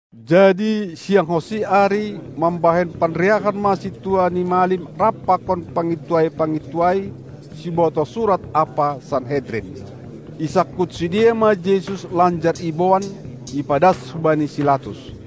Jadi sianghonsi ari mambahen panriahan ma sintua ni malim rap pakon pangintuai-pangintuai, sibotoh surat ampa Sanhedrin. Isangkut sidea ma Jesus lanjar iboan, ipadas hubani si Latus.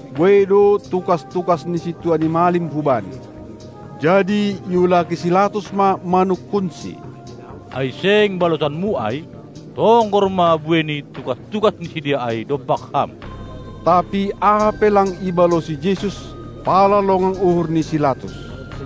Buei do tukas-tukas ni sintua ni malim hu Bani. Jadi iulaki si Latus ma manungkunsi: Ai seng balosanMu ai? Tonggor ma buei ni tukas-tukas ni sidea ai dompak Ham! Tapi aha pe lang ibalosi Jesus, pala longang uhur ni si Latus.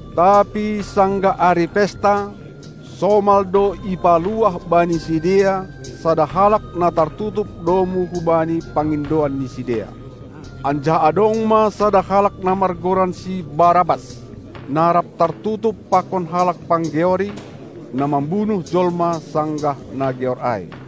Tapi sanggah ari pesta, somal do ipaluah bani sidea sada halak na tartutup domu hubani pangindoan ni sidea. Anjaha adong ma sada halak na margoran si Barabas, na rap tartutup pakon halak panggeori, na mambunuh jolma sanggah na geor ai.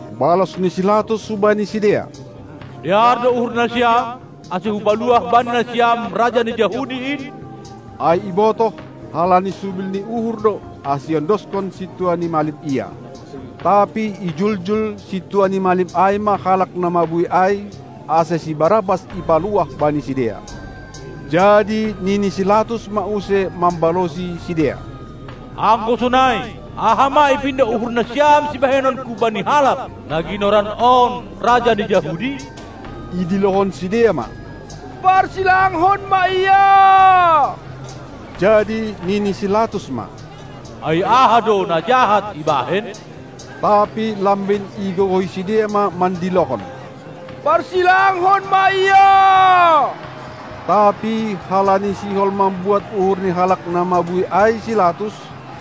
Balos ni si Latus hubani sidea: Dear do uhur nasiam, ase hupaluah bani nasiam Raja ni Jahudi in? Ai ibotoh, halani subil ni uhur do, ase iondoskon sintua ni malim Ia. Tapi ijuljul sintua ni malim ai ma halak na mabuei ai, ase si Barabas ipaluah bani sidea. Jadi nini si Latus ma use mambalosi sidea: Anggo sonai, aha ma ipindo uhur nasiam sibahenonku bani halak, na ginoran on: Raja ni Jahudi? Idilohon sidea ma: Parsilangkon ma Ia! Jadi nini si Latus ma: Ai aha do na jahat ibahen? Tapi lambin igogohi sidea ma mandilohon: Parsilangkon ma Ia! Tapi halani sihol mambuat uhur ni halak na mabuei ai si Latus,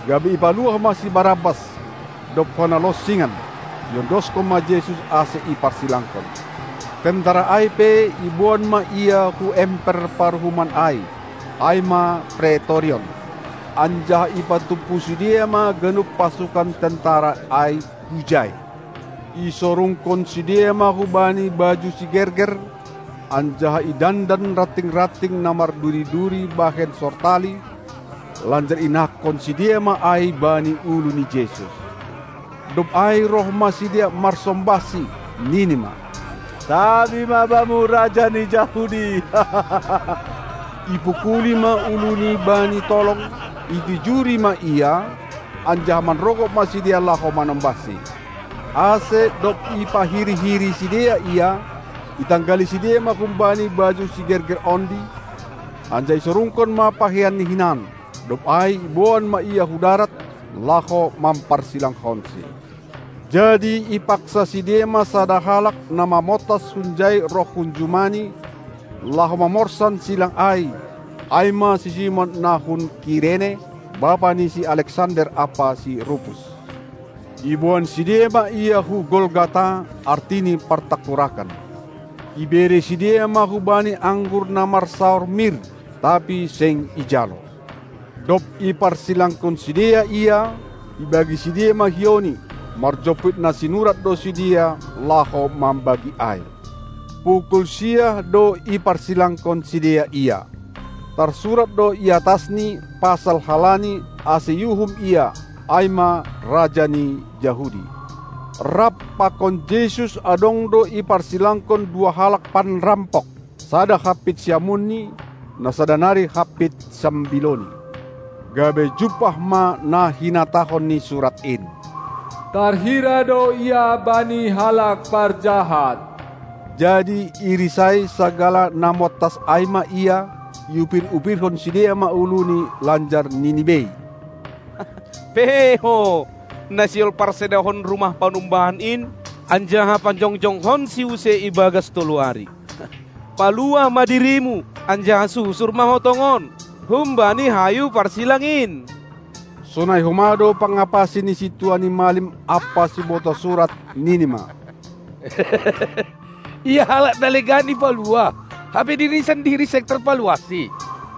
gabe ipaluah ma si Barabas; dob hona lonsingan, iondoskon ma Jesus, ase iparsilangkon. Tentara ai pe iboan ma Ia hu emper paruhuman ai (ai ma Pretorion), anjaha ipatumpu sidea ma ganup pasukan tentara ai hujai. Isorungkon sidea ma hu Bani baju sigerger, anjaha idandan ranting-ranting na marduri-duri bahen sortali, lanjar inahkon sidea ma ai bani ulu ni Jesus. Dob ai roh ma sidea marsombahSi, nini ma: Tabi ma Bamu, Raja ni Jahudi! Ipukuli ma uluNi bani tolong, itijuri ma Ia, anjaha manrogop ma sidea laho manombahSi. Ase dob ipahiri-hiri sidea Ia, itanggali sidea ma hum-Bani baju sigerger ondi, anjaha isorungkon ma pakeianni hinan. Dob ai iboan ma Ia hu darat, laho mamparsilangkonSi. Jadi ipaksa sidea ma sada halak, na montas hunjai roh hunjumani, laho mamorsan silang ai, ai ma si Simon na hun Kirene, bapa ni si Alexander ampa si Rupus. Iboan sidea ma Ia hu Golgata (artini partangkurakan). Ibere sidea ma hu Bani anggur na marsaor mir, tapi seng ijalo. Dob iparsilangkon sidea Ia, ibagi sidea ma hiouNi; marjomput na sinurat do sidea, laho mambagi ai. Pukul siah do iparsilangkon sidea Ia. Tarsurat do i atasNi pasal halani, ase iuhum ia, ai ma: Raja ni Jahudi. Rap pakon Jesus adong do iparsilangkon dua halak panrampok, sada hampit siamunNi, na sada nari hampit sambilouNi. Gabe jumpah ma na hinatahon ni surat in: Tarhira do Ia bani halak parjahat. Jadi irisai sagala na montas ai ma Ia, iupir-upirhon sidea ma uluni, lanjar nini bei: Pe Ho, na sihol parsedahon rumah panumbahan in, anjaha pajongjongkonSi use i bagas tolu ari! Paluah ma diriMu, anjaha susur ma Ho tongon humbani hayu parsilang in! Sonai homa do pangapasi ni sintua ni malim ampa sibotoh surat, nini ma: Ia halak na legan ipaluah, hape diriNi sandiri seng tarpaluahSi.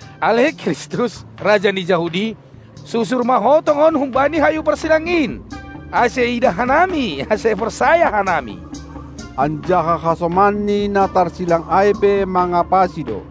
Ale Kristus, Raja ni Jahudi! Susur ma Ho tongon humbani hayu parsilang in, ase iidah hanami, ase porsaya hanami! Anjaha hasomanNi na tarsilang ai pe mangapasi do.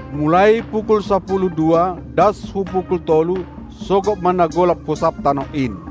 Mulai pukul sapuluh dua das hu pukul tolu sogop ma na golap hu sab tanoh in.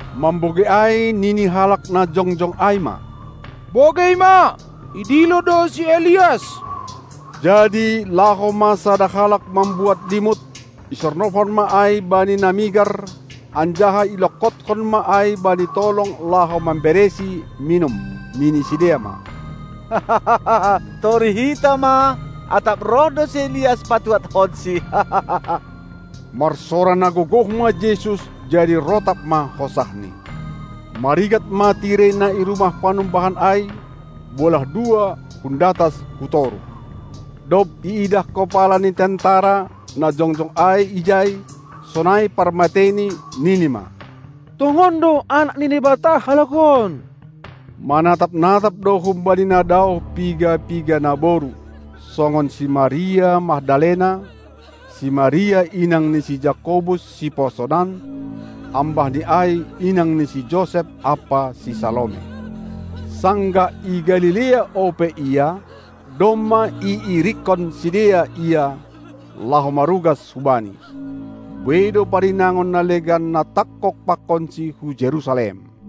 Mambogei ai nini halak na jongjong ai ma: Bogei ma, idilo do si Elias! Jadi laho ma sada halak mambuat limut, isornobhon ma ai bani na migar, anjaha ilongkothon ma ai bani tolong laho mambereSi minum. Nini sidea ma: Torih hita ma, atap roh do si Elias patuadhonSi! Marsora na gogoh ma Jesus, jadi rotap ma hosahNi. Marigat ma tirei na i rumah panumbahan ai, bolah dua hun datas hu toruh. Dob iidah kopala ni tentera, na jongjong ai ijai, sonai parmateini, nini ma: Tongon do Anak ni Naibata halak on! Manatap-natap do humbani na daoh piga-piga naboru songon si Maria Magdalena, si Maria inang ni si Jakobus siposonan, ambah ni ai inang ni si Josep, ampa si Salome. Sanggah i Galilea ope Ia, domma iirikkon sidea Ia, laho marugas hu Bani. Buei do parinangon na legan na tangkog pakonSi hu Jerusalem.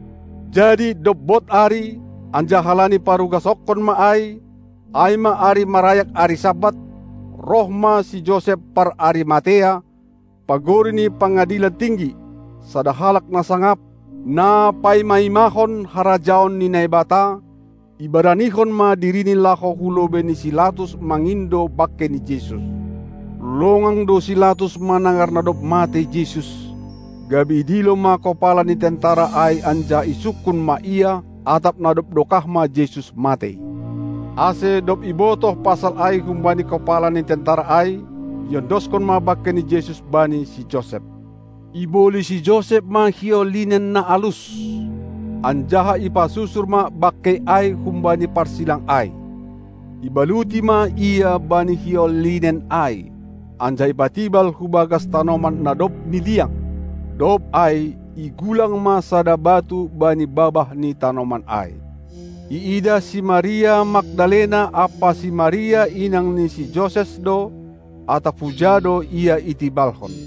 Jadi dob bod ari, anjaha halani parugasonkon ma ai, ai ma ari marayak ari Sabat, roh ma si Josep par Arimatea, pagori ni pangadilan tinggi, sada halak na sangap, na paima-imahon harajaon ni Naibata; ibaranihon ma dirini laho hu lobei ni si Latus mangindo bangkei ni Jesus. Longang do si Latus manangar na dob matei Jesus, gabe idilo ma kopala ni tentara ai anjaha isungkun ma ia, atap na dob dokah ma Jesus matei. Ase dob ibotoh pasal ai humbani kopala ni tentara ai, iondoskon ma bangkei ni Jesus bani si Josep. Iboli si Josep ma hiou linen na alus, anjaha ipasusur ma bangkei ai humbani parsilang ai. Ibaluti ma Ia bani hiou linen ai, anjaha ipatibal hu bagas tanoman na dob niliang, dob ai igulang ma sada batu bani babah ni tanoman ai. Iidah si Maria Magdalena ampa si Maria inang ni si Joses do, atap huja do Ia itibalhon.